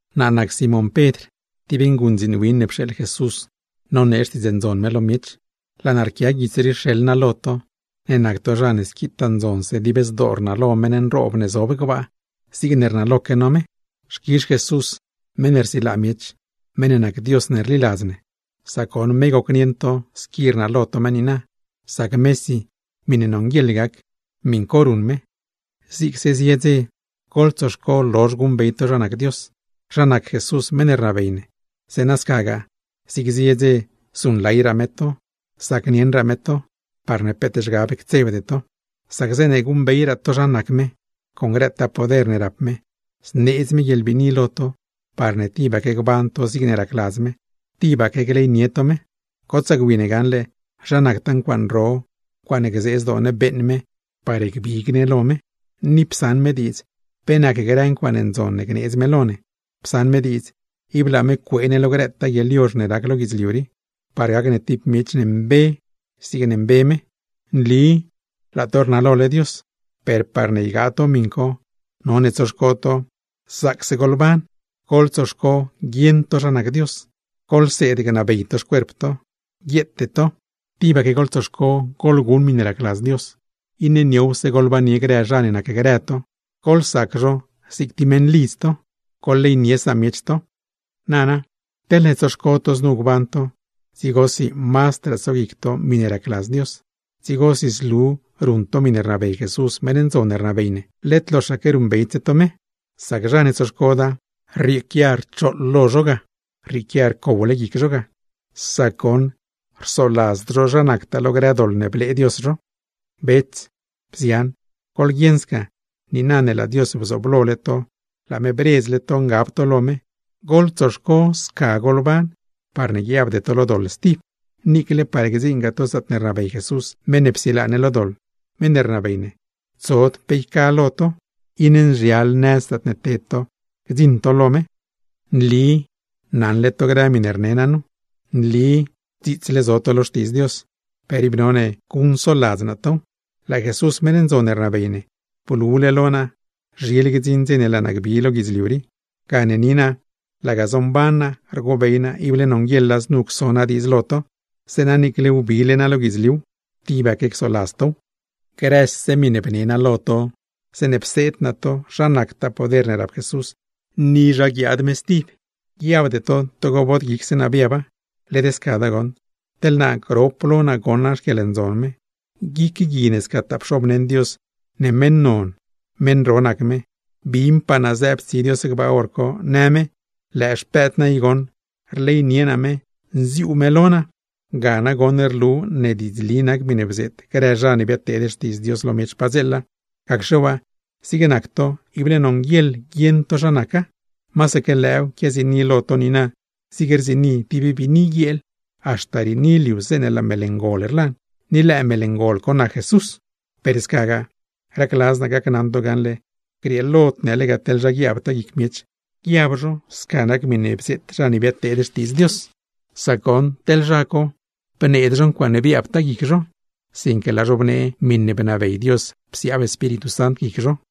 Naa nac Simón Pedr, tib nguṉdziin win ne pxeeḻ Jesús nonee Xtiidz Ndzon me lo miech. Laa naa rquia guits rii rxeḻ naa lo to, ne nac to zha ne squitaa ndzonse dib zdoo rnalo meṉ nroob ne zob gbaa, zigne rnaloque no me. Xquizh Jesús meṉ ne rsilaa miech, meṉ ne nac Dios ne rliladz ne, sac goṉ me gocnieṉ to squi rnalo to me niina; sac mesi miṉe nonguieḻ gac, miṉ co ruṉ me. Zigse zie dze, goḻtsoxco lozh guṉbey to zha nac Dios, zha nac Jesús meṉ ne rnabey ne, zeeṉa scagaa zig zie dze zuṉlayraa me to, zacnieṉraa me to, parne peet zhgab ctsebde to. Sac zeeṉe guṉbey to zha nacraa me, con grëtaa poder ne rap me, zneedz me guieḻbiini lo to parne tibaque gban to zigne racladz me, tibaque gleynie to me. ¡Gotsaa gwi ne gaṉle zha nactaa ncuaaṉe ro, ncuaaṉe gzee zdoo ne beeṉ me parne gbig ne lo me! Ni psaṉ me diidz pe nac grë ncuaaṉe ndzon ne gneedz me lo ne. Psaṉ me diidz, ib laa me cuee ne lo grëtaa guieḻyozh ne rac lo guidzliu rii, parne gac ne tib miech mbe zigne nac me. Nli laa to rnalole Dios, per parne ygaa to miṉ co, none tsoxco to: zaacse goḻban, goḻtsoxco guieṉ to zha nac Dios, goḻseed gnabey to xcuerp to, guieete to, tibaque goḻtsoxco goḻguṉ miṉe racladz Dios, iṉe niowse goḻbannie grë zha ne nacgrë to, goḻsac zho zig tib meṉlidz to; goḻleynie samiech to. Nana, teḻne tsoxco to znu gban to, dzigosi mazdraa tsoguic to miṉe racladz Dios, dzigosi zlu ruṉ to miṉe rnabey Jesús meṉ ndzon ne rnabey ne, led loxaque ruṉbeydse to me. Sac zha ne tsoxcoda, rrieequia rchooḻ lo zho ga, rrieequia rcowle guic zho ga, sac goṉ rsoladzd zho zha nactaa lo grë doḻ ne blee Dios zho. Bets, bzian, goḻguieṉ sca, niina ne laa Dios bzooblole to, laa me bredzle to ngab to lo me, goḻtsoxco sca goḻban, parne guiabde to lo doḻ stib. Niicle par gdziṉgaa to zaatne rnabey Jesús, meṉ ne psilaa ne lo doḻ, meṉ ne rnabey ne, tsod pe yca lo to, iṉe nzhial nëz zaatne ted to gdziṉ to ga. Nli naṉle to grë miṉe rne naa nu, nli dziitsle zo to lo Xtiidz Dios, per ib none guṉcsoladz naa tow. Laa Jesús meṉ ndzon ne rnabey ne, blule lo naa zhile gdziṉ dze ne laa naa gbi lo guidzliu rii, gane niina laga bii mban naa rgobey naa ible nonguieḻa znu cso naa diidz lo to; zeeṉa niicle wbile naa lo guidzliuw, tibaque csoladz tow. Grëse miṉe bnee no lo to zeeṉe pseed no to zha nactaa poder ne rap Jesús, ni zha guiaad me stib, guiabde to togo bod guicse no biaba. Led scada goṉ, teḻ naa grop lo naa goṉ naa xquieḻndzon me guic gui ne scataa pxobneṉ Dios ne meṉ non, meṉ ro nac me. Binpaa naa zëëb tsi Dios gbaa hor co, në me: “Lëë Xpëëd naa i goṉ, rleynie naa me, nziuu me lo naa.” Ga nagoṉ rlu ne diidzli nac grë miṉe bzeet grë zha ne biadteed Xtiidz Dios lo miech padzeela; gacxe waa, zig nac to ible nonguieḻ guieṉ to zha naca. Masaque lëëw quiaziini lo to niina, zig rziini tib biini guieel, haxta riini liu zeeṉe laa Mel Ngol rlan; ni lëë Mel Ngol co nac Jesús. Per scagaa, racladz naa gacnaṉ to gaṉle, grieelod ne lega teḻ zha guiaabtaa guic miech, guiab zho sca nac miṉe bzeet zha ne biadteed Xtiidz Dios, sac goṉ teḻ zha co, bneed zho ncuaaṉe biaabtaa guic zho; sinque laa zho bnee miṉe bnabey Dios psiaab Espíritu Sant guic zho.